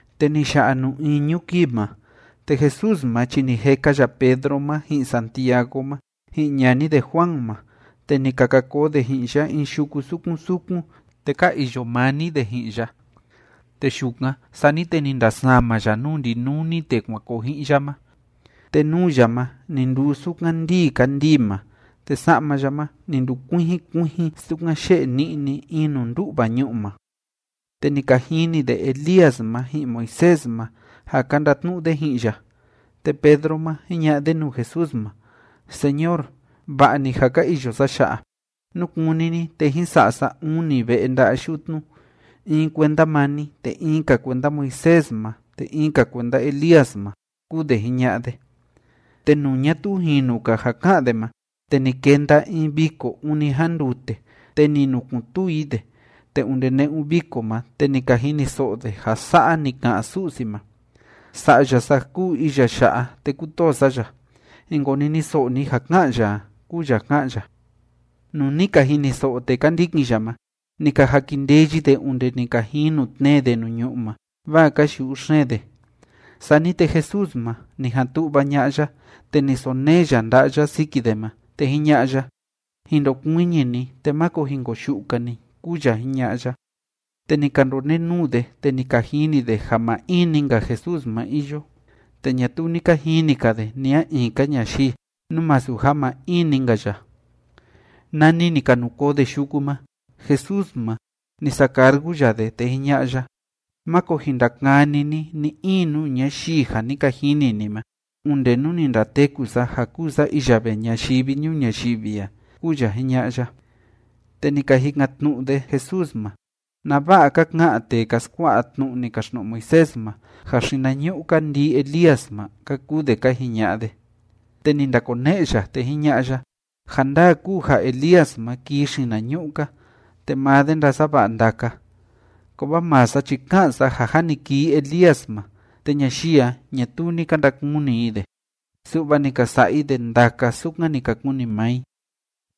Te ni ya'a nuu iñu kii ma, te Jesús ma chi ni jeka ya Pedro ma, ji'in Santiago ma, ji'in ñani de Juan ma, te ni ka ka koo de ji'in ya in yuku sukun sukun, te ka iyo maa‑ni de ji'in ya. Te yukan, sani te ni ndasama ya nuu ndinuni tee kuan koo ji'in ya ma. Te nuu ya ma ni nduu sukan ndíi kandii ma, te sa'ma ya ma ni ndukuijin kuijin sukan yé'e ni'ni in nuu ndú'va ñu'u ma. Te ni ka jini de Elías ma ji'in Moisés ma, ja ka ndatnu'u de ji'in ya. Te Pedro ma, jiña'a de nuu Jesús ma: ―Señor, ¡va'a‑ni ja ka iyo sa ya'a! Nú kúni ni, te jín sa'a sa uni ve'e nda'a yutnu, in kuenda maa ni, te in‑ka kuenda Moisés ma, te in‑ka kuenda Elías ma ―kúu de jiña'a de. Te nuu ñatuu jinu‑ka ja ká'an de ma, te ni kenda in viko ûni jandute, te ni nukun‑tuu i de. Te onde ne'un viko ma, te ni ka jiniso'o de ja sa'a ni ka'an Su'si ma: ―Sa'ya sa kúu iya ya'a, te kútoo sa ya. Jin koniniso'o ni ja ká'an ya a ―kúu ya ká'an ya. Nuu ni ka jiniso'o tee ka ndikin ya ma, ni ka jakindeyi de onde ni ka jinu tnee de nuu ñu'ú ma, vaa ka yu'u xeen de. Sani te, Jesús ma, ni jan tu'va ña'a ya, te ni sonee ya nda'a ya siki de ma, te jiña'a ya: ―Jin ndokuiñi ni, te máko jin koyu'u‑ka ni ―kúu ya jiña'a ya. Te ni ka ndonenuu de, te ni ka jini de ja maa in‑ni‑nka Jesús ma iyo. Te ñatuu ni ka jini‑ka de ni a in‑ka ñayii, nú masu ja maa in‑ni‑nka ya. Nani ni ka nu koo de yuku ma, Jesús ma, ni sacargu ya de, te jiña'a ya: ―Máko jin ndakani ni ni‑in nuu ñayii ja ni ka jini ni ma, onde nú ni ndateku sa ja kúu sa iya vee ñayivi ñuu ñayivi a ―kúu ya jiña'a ya. Te ni ka jikan‑tnu'u de Jesús ma: ―¿Nava'a ka ka'an tee ka skua'a tnu'u ni kaxtnu'u Moisés ma ja xinañu'u‑ka ndii Elías ma? ―ka kuu de ka jiña'a de. Te ni ndakone'e ya, te jiña'a ya: ―Ja ndaa kúu ja Elías ma kii xinañu'u‑ka, te maa de ndasava'a ndaka. Kovaa maa sa chi ká'an sa ja jâ ni kii Elías ma, te ñayii a, ñatuu ni ka ndakuni i de, su'va ni ka sa'a i de ndaka sukan ni ka kuni maa i.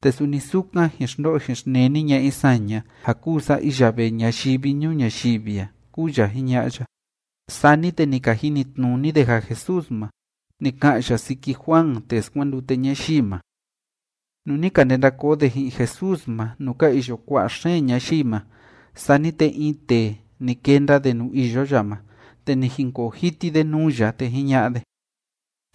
Te suni sukan jin xndo'o jin xneni ña'a i saña ja kúu sa iya vee ñayivi ñuu ñayivi a ―kúu ya jiña'a ya. Sani te ni ka jinitnuni de ja Jesús ma, ni ka'an ya siki Juan tee skuandute ñayii ma. Nuu ni ka ndenda koo de ji'in Jesús ma nuu ka iyo kua'a xeen ñayii ma, sani te in tee, ni kenda de nuu iyo ya ma, te ni jinkoo jiti de nuu ya, te jiña'a de: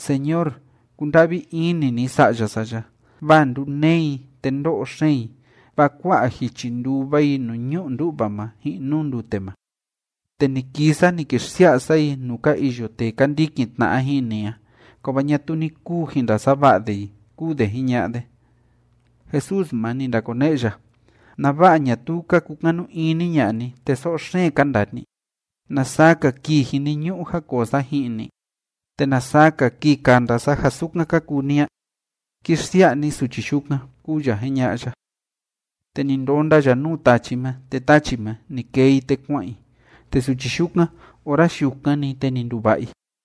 ―Señor, kunda'vi ini ni sa'ya sa ya, vaa nduneé i, te ndó'o xeen i, vaa kua'a jichi ndúva i nuu ñu'u ndú'va ma ji'in nuu ndute ma. Te ni kii sa ni ki xsia'a sa i nuu ka iyo tee ka ndikin tna'a ji'in ni a, kovaa ñatuu ni kuu jin ndasava'a de i ―kúu de jiña'a de. Jesús ma, ni ndakone'e ya: ―¿Nava'a ñatuu ka kukanu ini ña'a ni, te so'o xeen ka ndaa ni? ¿Na saa‑ka kii jiniñu'u ja koo sa ji'in ni? ¿Te na saa‑ka kii kanda sa ja sukan ka kuu ni a? Ki xsia'a ni suchi yukan ―kúu ya jiña'a ya. Te ni ndonda ya nuu tachi ma, te tachi ma, ni kee i, te kua'an i. Te suchi yukan, ora yukan‑ni, te ni nduva'a i.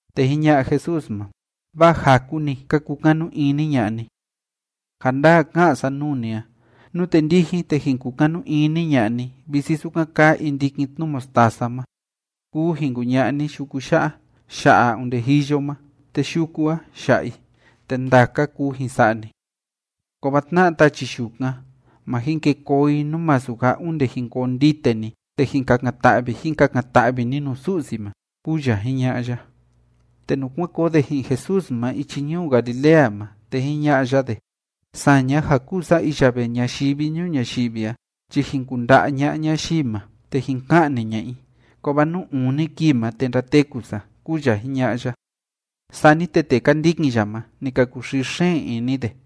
Te jiña'a Jesús ma: ―Vaa jaku‑ni ka kukanu ini ña'a ni. Ja ndaa ká'an sa nuu ni a, nute ndijin, te jin kukanu ini ña'a ni, visi sukan kaa in ndikin tnu mostaza ma, kuu jin kuña'a ni yuku ya'a: “Ya'a onde jiyo ma”, te yuku a, ya'a i. Te ndaka kuu jin sa'a ni. Kovaa tna'a tachi yukan, ma jin ke koo i, nú masu ja onde jin koo ndite ni te jin kakan‑ta'vi jin kakan‑ta'vi ni nuu Su'si ma ―kúu ya jiña'a ya. Te nuu kuan koo de ji'in Jesús ma ichi ñuu Galilea ma, te jiña'a ya de: ―Saña ja kúu sa iya vee ñayivi ñuu ñayivi a chi jin kunda'a ña'a ñayii ma, te jin ka'ni ña'a i. Kovaa nuu uni kivi ma, te ndateku sa ―kúu ya jiña'a ya. Sani te tee ka ndikin ya ma, ni ka kuxii xeen ini de.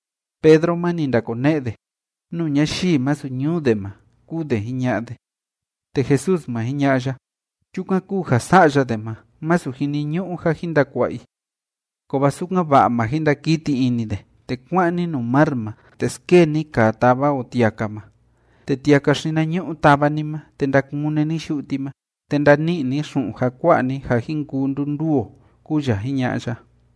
Pedro ma, ni ndakone'e de: ―Nuu ñayii masu ñuu de ma ―kúu de jiña'a de. Te Jesús ma, jiña'a ya: ―Chukan kúu ja sa'ya de ma, masu jiniñu'u ja jin ndakua'a i. Kovaa sukan‑va'a ma jin ndakiti ini de, te kua'an ni nuu mar ma, te skee ni kaa táva o tiaka ma, te tiaka xinañu'u tava ni ma, te ndakune ni yu'u ti ma, te ndani'i ni xu'un ja kua'a ni ja jin kuu ndunduu o ―kúu ya jiña'a ya.